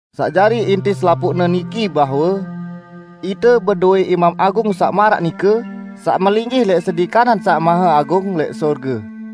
Saq jari inti selapuqne niki bahwe: Ite bedowẽ Imam Agung saq maraq nike, saq melinggih lẽq sedi kanan Saq Maheagung lẽq sorge.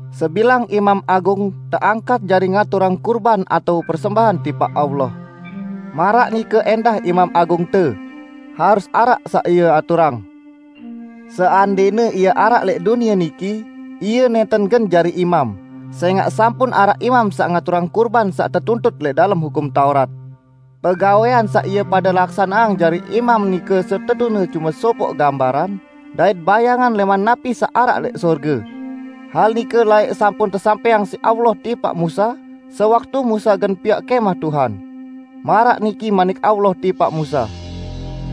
Sebilang imam agung teangkat jari ngaturang kurban atao persembahan tipaq Allah. Maraq nike ẽndah Imam Agungte; Ie harus araq saq Ie aturang. Seandẽne Ie araq lẽq dunie niki, Ie nẽnten gen jari imam, sẽngaq sampun araq imam saq ngaturang kurban saq tetuntut lẽq dalem Hukum Taurat. Pegawẽan saq ie pade laksaneang jari imam nike setetune cume sopoq gambaran dait bayangan lẽman napi saq araq lẽq sorge. Hal nike laẽq sampun tesampẽang siq Allah tipaq Musa, sewaktu Musa gen piaq Kẽmah Tuhan. Maraq niki Manik Allah tipaq Musa,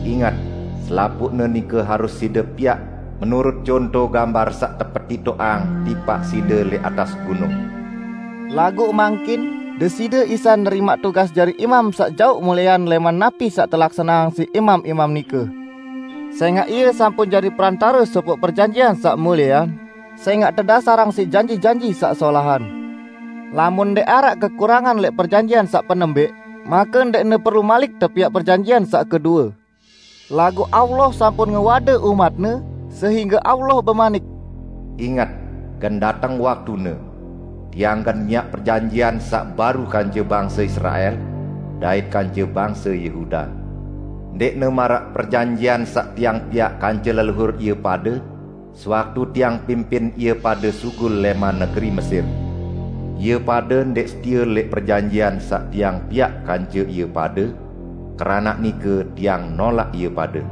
"Inget! selapuqne nike harus side piaq menurut conto gambar saq tepetitoqang tipaq side lẽq atas gunung." Laguq mangkin Deside Isa nerimaq tugas jari imam saq jaoq muliean lẽman napi saq telaksaneang siq imam-imam nike. Sẽngaq Ie sampun jari Perantare sopoq perjanjian saq muliean, sẽngaq tedasarang siq janji-janji saq solahan. Lamun ndẽq araq kekurangan lẽq perjanjian saq penembẽq, make ndẽqne perlu malik tepiaq perjanjian saq kedue. Laguq Allah sampun ngewade umat-Ne, sehingge Allah bemanik, "Inget! gen dateng waktune, Tiang gen miaq perjanjian saq baru kance bangse Israel, dait kance bangse Yehuda. Ndẽqne maraq perjanjian saq Tiang piaq kance leluhur ie pade sewaktu Tiang pimpin ie pade sugul lẽman negeri Mesir. Ie pade ndẽq setie lẽq perjanjian saq Tiang piaq kance ie pade, keranaq nike Tiang nolaq ie pade."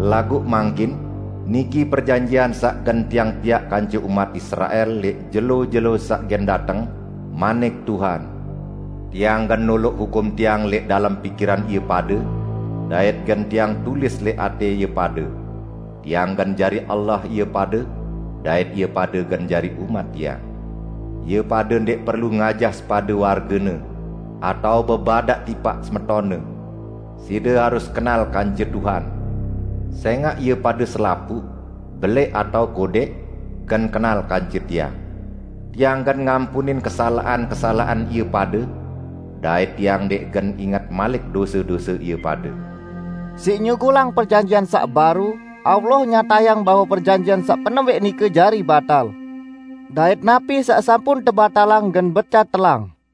Laguq mangkin, niki perjanjian saq gen Tiang piaq kance umat Israel lẽq jelo-jelo saq gen dateng, manik Tuhan: "Tiang gen noloq hukum Tiang lẽq dalem pikiran ie pade, dait gen Tiang tulis lẽq atẽ ie pade. Tiang gen jari Allah ie pade, dait ie pade gen jari umat Tiang." Ie pade ndẽq perlu ngajah sepade wargene, atao bebadaq tipaq semetonne, "Side harus kenal kance Tuhan." Sẽngaq ie pade selapuq, belẽq atao kodẽq, gen kenal kance Tiang. Tiang gen ngampunin kesalaqan-kesalaqan ie pade, dait Tiang ndẽq gen inget malik dose-dose ie pade. Siq nyugulang perjanjian saq baru, Allah nyatayang bahwe perjanjian saq penembẽq nike jari batal, dait napi saq sampun tebatalang gen becat telang.